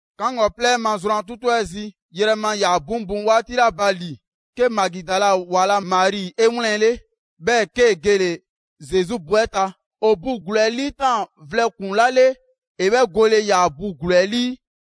'Kaŋgɔplɛ 'ɛ ma zrwan 'tutu 'ɛ zi, yrɛma ‑yaa 'buŋbuŋ 'waati 'la ba ‑li, 'ke Magidala ‑wa la Mari 'e 'wlɛnle‑, 'bhɛɛ‑ 'kee‑ gele‑ Zesu bu 'ɛ ta. ‑O bu ‑gluu 'ɛ 'liitaan‑ vlɛ ‑kpuŋ 'la 'le, ‑e 'bhɛ gole ꞊ya bu ‑gluu 'ɛ 'lii.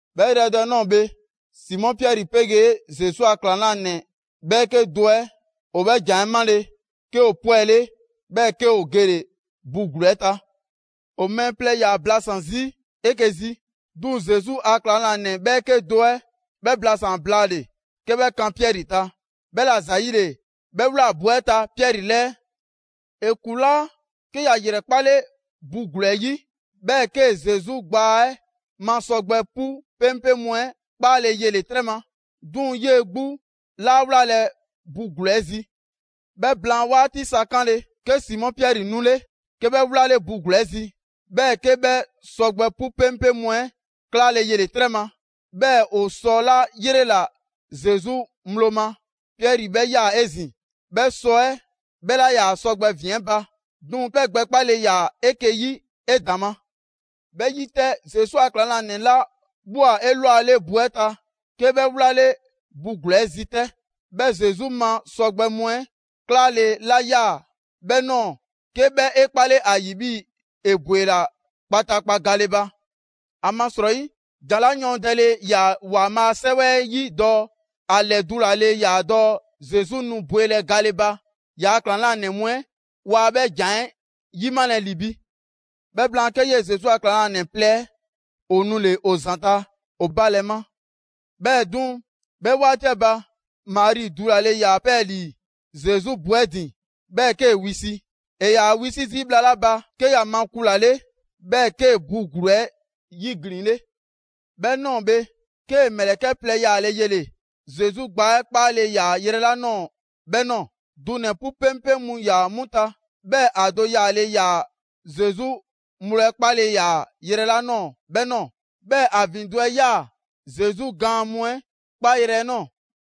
'Bhɛ yrɛ do 'ɛ ꞊nɔɔ bhe, Simɔ Piɛri 'pegee Zesu a ‑klaŋlanɛ 'bhɛɛke do 'ɛ ‑o 'bhɛ ‑jan 'ɛ 'male‑, 'ke ‑o 'pwɛle, 'bhɛɛ‑ 'ke ‑o gele‑ bu ‑gluu 'ɛ ta. ‑O mɛɛ plɛ ‑yaa blasan‑ 'zi 'eke‑ zi; 'duŋ‑ Zesu a ‑klaŋlanɛ ‑bhɛɛke' do 'ɛ 'bhɛ blasaan‑ blaale‑ 'ke 'bhɛ kan Piɛri ta. 'Bhɛla ‑zayile 'bhɛ ꞊wlaa bu 'ɛ ta Piɛri 'lɛɛ. ‑E ‑kulaa', 'ke ‑ya ‑yrɛkpale bu ‑gluu 'ɛ 'yi, 'bhɛɛ‑ 'kee‑ Zesu gbaa 'ɛ ma sɔgbɛ 'pu 'peŋpeŋ mu 'ɛ 'kpaale‑ 'yele‑ 'trɛ ma. 'Duŋ‑ 'yee‑ 'gbu 'laa wlalɛ bu ‑gluu 'ɛ zi. 'Bhɛ blaan 'waati sa 'kanle‑, 'ke Simɔ Piɛri 'nule; 'ke 'bhɛ 'wlale bu ‑gluu 'ɛ zi. 'Bhɛɛ‑ 'ke 'bhɛ sɔgbɛ 'pu 'peŋpeŋ mu 'ɛ klaale yele‑ 'trɛ ma. 'Bhɛɛ‑ ‑o sɔ 'la 'yrela‑ Zesu ŋgblo ma Piɛri 'bhɛ ꞊ya 'ezin‑; 'bhɛ sɔ 'ɛ 'bhɛ 'laa ‑yaa sɔgbɛ ‑vin 'ɛ ba, 'duŋ‑ 'bhɛ gbɛkpale ‑yaa 'eke‑ 'yi 'edaŋma. 'Bhɛ 'yi 'tɛ, Zesu a ‑klaŋlanɛ 'la ꞊bhwa 'elwale bu 'ɛ ta, 'ke 'bhɛ 'wlale bu ‑gluu 'ɛ zi 'tɛ. 'Bhɛ Zesu ma sɔgbɛ mu 'ɛ 'klaale‑ 'la ꞊ya 'bhɛ ꞊nɔɔ, 'ke 'bhɛ 'e 'kpale ‑a ‑yi 'bhii‑ ‑e ‑bwela kpataakpa gale ba. ‑Amasrɔyi, ‑jan 'la yɔɔndɛle ‑yaa ‑Waanbhaa' a 'Sɛwɛ 'yi dɔɔ ‑a ‑lɛdulale ‑yaa dɔɔ Zesu nu bwelɛ gale ba, ‑yaa' ‑klaŋlanɛ mu 'ɛ waa 'bhɛ ‑jan 'ɛ 'yimalɛ ‑li ‑bi. 'Bhɛ blaan, 'ke 'yee‑ Zesu a ‑klaŋlanɛ plɛ 'ɛ ‑o nule‑ ‑o ‑zanta' ‑o ba ‑lɛ ma. 'Bhɛɛ‑ 'duŋ‑, 'bhɛ 'waati 'ɛ ba, Mari dulale ‑yaa 'pɛɛlii‑ Zesu bu 'ɛ ‑din, 'bhɛɛ‑ 'kee‑ wisi. ‑E ‑yaa wisi zii' bhla 'la ba, 'ke ‑ya makulale, 'bhɛɛ‑ 'kee‑ bu ‑gluu 'ɛ 'yiglinle. 'Bhɛ ꞊nɔɔ bhe, 'kee‑ ‑mlɛkɛ' plɛ yaale yele‑ Zesu gbaa 'ɛ 'kpaale‑ ‑yaa yrɛ 'la ꞊nɔɔ 'bhɛ ꞊nɔɔ. Dunɛ‑ 'pu 'peŋpeŋ mu ‑yaa 'mu ta, 'bhɛɛ‑ ‑a do yaale ‑yaa Zesu ŋgblo 'ɛ 'kpaale‑ ‑yaa yrɛ 'la ꞊nɔɔ 'bhɛ ꞊nɔɔ. 'Bhɛɛ‑ ‑a ‑vindo' 'ɛ 'yaa‑ Zesu gaan mu 'ɛ 'kpaayrɛ‑ 'ɛ ꞊nɔɔ.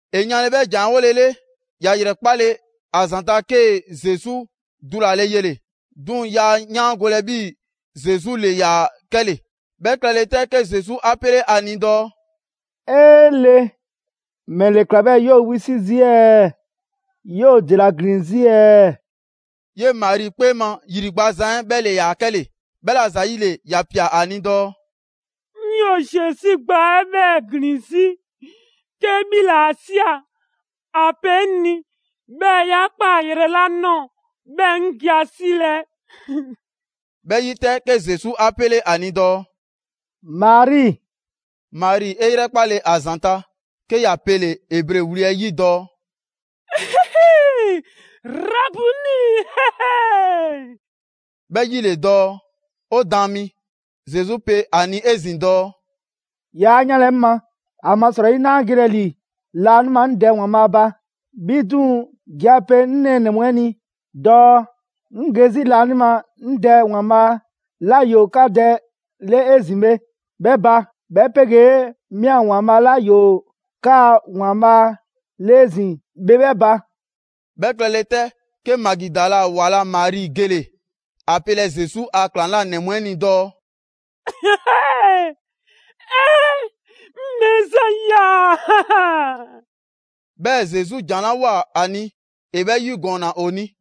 ‑E yanle 'bhɛ ‑jan 'ɛ 'wolele, ‑ya ‑yrɛkpale ‑a ‑zanta', 'kee‑ Zesu dulale yele‑, 'duŋ‑ yaa 'yaangolɛ 'bhii‑ Zesu ‑le ‑yaa 'kɛle‑. 'Bhɛ klɛle 'tɛ, 'ke Zesu 'a 'pele 'a ni dɔɔ: «'Ee Le, ‑mɛle ‑kla 'bhɛɛ‑ 'yoo‑ wisi' zii' ɛɛ? 'Yoo‑ ‑dela ‑glin 'zi ɛɛ?» 'Yee‑ Mari 'kpee ma ‑yri gbazan 'ɛ 'bhɛ ‑le ‑yaa 'kɛle‑, 'bhɛla‑ ‑zayile ‑ya ꞊pia ‑a ni dɔɔ: «'Ŋ 'yoo‑ Zesu gbaa 'ɛ 'bhɛɛ‑ ‑glin 'zi. 'Ke 'bhi ‑le 'a ꞊sia, ‑a pe 'ŋ ni, 'bhɛɛ‑ 'ya ꞊kpaa yrɛ 'la ꞊nɔɔ, 'bhɛɛ‑ 'ŋ ge ‑a 'silɛ‑.» 'Bhɛ 'yi 'tɛ, 'ke Zesu 'a 'pele ‑a ni dɔɔ: «Mari!» Mari 'e 'yrɛkpale ‑a ‑zanta', 'ke ‑ya pele‑ Ebre wli 'ɛ 'yi dɔɔ: «Rabuni!» ('Bhɛ 'yi ‑le dɔɔ: «'O Daan mi.») Zesu pe a ni 'ezin‑ dɔɔ: «'Yaa 'yanlɛ‑ 'ŋ ma, ‑amasrɔyi 'naa gelɛ ‑li laanima 'ŋ Dɛ ‑Waanbhaa' ba. 'Bhi 'duŋ‑ ge ‑a pe 'ŋ nɛɛnɛ‑ mu 'ɛ ni dɔɔ 'ŋ ge 'zi laanima 'ŋ Dɛ ‑Waanbhaa' 'la ‑yoo 'ka Dɛ 'le 'ezin‑ bhe 'bhɛ ba; 'bhɛ 'pegee 'mi 'a ‑Waanbhaa' 'la ‑yoo 'kaa‑ ‑Waanbhaa' 'le 'ezin‑ bhe 'bhɛ ba.» 'Bhɛ klɛle 'tɛ, 'ke Magidala ‑wa la Mari gele‑ ‑a pelɛ Zesu a ‑klaŋlanɛ mu 'ɛ ni dɔɔ: «'Ee! 'Ŋ Mɛɛzan ꞊ya!» 'Bhɛɛ‑ Zesu ‑jan 'la ꞊woa ‑a ni, ‑e 'bhɛ 'yigɔɔnna ‑o ni.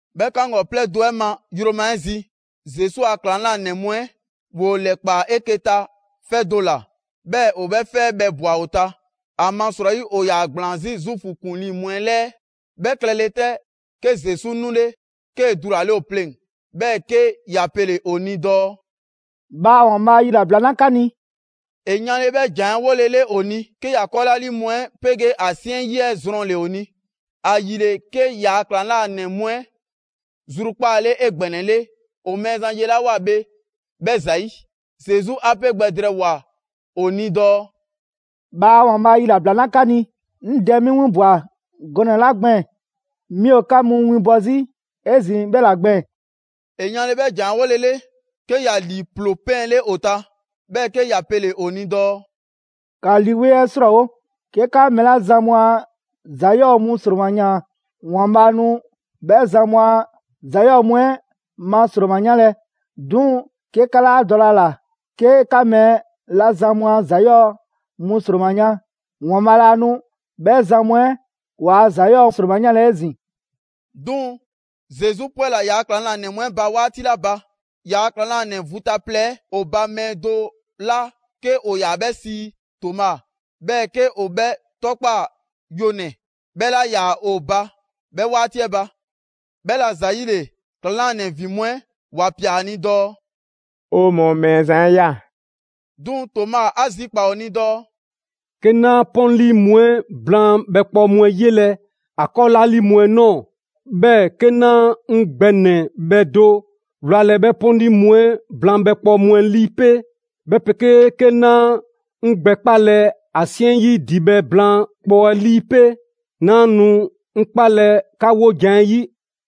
'Bhɛ 'kaŋgɔplɛ do 'ɛ ma yroma 'ɛ zi, Zesu a ‑klaŋlanɛ mu 'ɛ ‑woo ‑lɛkpaa 'eke‑ ta 'fɛ do ‑la, 'bhɛɛ‑ ‑o 'bhɛ 'fɛ 'ɛ bhɛ ꞊bwa ‑o ta; ‑amasrɔyi ‑o ‑yaa ‑gblaan 'zi Zuufu ‑kuŋlii mu 'ɛ 'lɛɛ. 'Bhɛ klɛle 'tɛ, 'ke Zesu 'nule, 'kee‑ dulale ‑o pleŋ‑, 'bhɛɛ‑ 'ke ‑ya pele‑ ‑o ni dɔɔ: «Bhaa ‑Waanbhaa' yilabla 'na 'ka ni!» ‑E yanle 'bhɛ ‑jan 'ɛ 'wolele ‑o ni, 'ke ‑ya 'kɔɔlaalii mu 'ɛ 'pegee ‑a 'siɛn 'yi 'ɛ zrɔnle‑ ‑o ni. ‑Ayile, 'ke ‑yaa' ‑klaŋlanɛ mu 'ɛ zrukpaale 'egbɛnɛle ‑o Mɛɛzan 'yelawoa bhe 'bhɛ ‑zayi'. Zesu 'a 'pe gbɛ drɛɛwoa‑ ‑o ni dɔɔ: «Bhaa ‑Waanbhaa' yilabla 'na 'ka ni! 'Ŋ Dɛ 'mi 'winbwa‑ gɔnɛ‑ 'la gbɛɛn‑ 'mi ‑o 'ka mu winbɔ 'zi 'ezin‑ 'bhɛ ‑la gbɛɛn‑.» ‑E yanle 'bhɛ ‑jan 'ɛ 'wolele, 'ke ‑ya ‑lii ‑ploo 'pɛɛnle ‑o ta, 'bhɛɛ‑ 'ke ‑ya pele‑ ‑o ni dɔɔ: «‑Ka Lii 'Weŋ 'ɛ 'srɔɔwo! 'Ke 'ka mɛɛ 'la zan mu a ‑za 'yɔɔ‑ mu ‑sroma ‑yaan, ‑Waanbhaa' nu 'bhɛ zan mu a ‑za 'yɔɔ‑ mu 'ɛ ma ‑sroma 'yanlɛ‑; 'duŋ‑ 'ke 'ka 'laa dɔlɛ ‑a ‑la 'ke 'ka mɛɛ 'la zan mu a ‑za 'yɔɔ‑ mu ‑sroma yan, ‑Waanbhaa' laa nu 'bhɛ zan mu 'ɛ ‑waa' ‑za 'yɔɔ‑ ‑sroma 'yanlɛ‑ 'ezin‑.» 'Duŋ‑, Zesu 'pwɛla‑ ‑yaa' ‑klaŋlanɛ mu 'ɛ ba 'waati 'la ba, ‑yaa' ‑klaŋlanɛ vu ta plɛ 'ɛ, ‑o ba mɛɛ do 'la 'ke ‑o ‑yaa 'bhɛ sii Toma, 'bhɛɛ‑ 'ke ‑o 'bhɛ 'tɔkpaa‑ ‹Yonɛ‑›, 'bhɛ 'laa ‑yaa ‑o ba 'bhɛ 'waati 'ɛ ba. 'Bhɛla‑ ‑zayile, ‑klaŋlanɛ ‑vin mu 'ɛ ‑wa ꞊pia ‑a ni dɔɔ: «'O mɔɔ Mɛɛzan 'ɛ ꞊ya.» 'Duŋ‑ Toma 'a zikpaa‑ ‑o ni dɔɔ: «'Ke 'naa 'pɔnli mu 'ɛ blaan bhɛkpɔɔ mu 'ɛ 'yelɛ‑ ‑a 'kɔɔlaalii mu 'ɛ ꞊nɔɔ, 'bhɛɛ‑ 'ke 'naa 'ŋ gbɛnɛbhɛ do wlalɛ 'bhɛ 'pɔnli mu 'ɛ blaan bhɛkpɔɔ mu 'ɛ 'lii 'pe, 'bhɛ 'pegee 'ke 'naa 'ŋ gbɛ 'kpalɛ‑ ‑a 'siɛn 'yi ‑dibhɛ' blaan kpɔɔ 'ɛ 'lii 'pe, 'naa nu 'ŋ 'kpalɛ‑ 'ka 'wojan‑ 'ɛ 'yi.»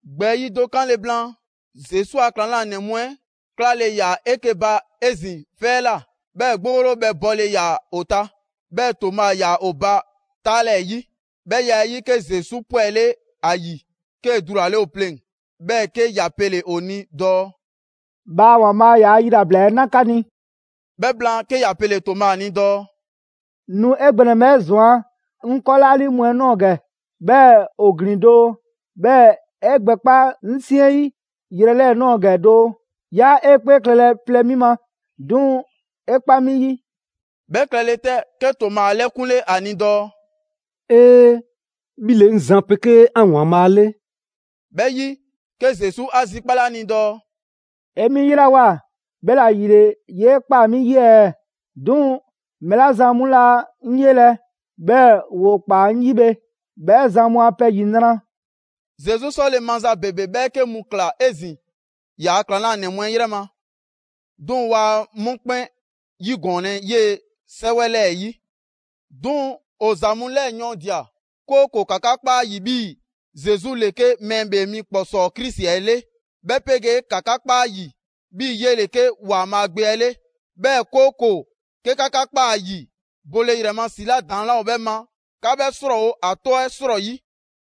‑Gbɛɛyi' do 'kanle‑ blaan, Zesu a ‑klaŋlanɛ mu 'ɛ 'klale‑ ‑yaa 'eke‑ ba 'ezin‑ 'fɛ 'ɛ ꞊la, 'bhɛɛ‑ 'gborobhɛ 'ɛ bɔle ‑yaa ‑o ta. 'Bhɛɛ‑ Toma ‑yaa ‑o ba 'taalɛɛyi. 'Bhɛ ya 'ɛ 'yi, 'ke Zesu 'pwɛle ‑a ‑yi, 'kee‑ dulale ‑o pleŋ‑, 'bhɛɛ‑ 'ke ‑ya pele‑ ‑o ni dɔɔ: «Bhaa ‑Waanbhaa' ‑yaa' yilabla 'ɛ 'na 'ka ni!» 'Bhɛ blaan, 'ke ‑ya pele‑ Toma ni dɔɔ: «Nu 'e gbɛ ‑nɛbhɛ' 'ɛ ꞊zwan 'ŋ 'kɔɔlaalii mu 'ɛ ꞊nɔɔ ‑gɛ, 'bhɛɛ‑ ‑o ‑glin doo; 'bhɛɛ‑ 'e gbɛ 'kpa 'ŋ 'siɛn 'yi yrɛ 'lɛɛ‑ ꞊nɔɔ gɛ doo. 'Yaa 'e 'kpee klɛlɛ plɛ 'mi ma, 'duŋ‑ 'e 'kpa 'mi 'yi!» 'Bhɛ klɛle 'tɛ, 'ke Toma 'a 'lɛkunle ‑a ni dɔɔ: «'Ee! 'Mi ‑le 'ŋ Zan 'pegee 'an ‑Waanbhaa' 'le!» 'Bhɛ 'yi, 'ke Zesu 'a zikpale 'a ni dɔɔ: «'E 'mi 'yelawoa, 'bhɛla‑ ‑yile 'yee ꞊kpaa 'mi 'yi ɛɛ? 'Duŋ‑ mɛɛ 'la zan mu laa 'ŋ 'yelɛ‑, 'bhɛɛ‑ ‑woo kpa 'ŋ 'yi bhe, 'bhɛ zan mu a pɛ ‑yinra'!» Zesu 'sɔle‑ maza ‑bebe 'bhɛɛke mu ꞊kla 'ezin‑ ‑yaa' ‑klaŋlanɛ mu 'ɛ 'yrɛ ma, 'duŋ‑ 'waa 'mu 'kpɛn 'yigɔɔnlɛ 'yee‑ 'sɛwɛ 'lɛɛ‑ 'yi. 'Duŋ‑ ‑o ‑za mu 'lɛɛ‑ yɔɔndia‑, 'kooko‑ 'ka 'ka kpa ‑a ‑yi 'bhii‑ Zesu ‑le 'ke Mɛɛ ‑Bhee Mi ‑Kpɔsɔɔ Krisi 'ɛ 'le, 'bhɛ 'pegee 'ka 'ka kpa ‑a ‑yi 'bhii‑ 'yele‑ 'ke ‑Waanbhaa' Gbe 'ɛ 'le. 'Bhɛɛ‑ 'kooko‑ 'ke 'ka 'ka꞊kpaa ‑a 'yi, bole ‑yrɛ ma ‑si 'la ‑daŋ' 'laa ‑o 'bhɛ ma, 'ka 'bhɛ 'srɔɔwo‑ ‑a 'tɔ 'ɛ ‑srɔyi'.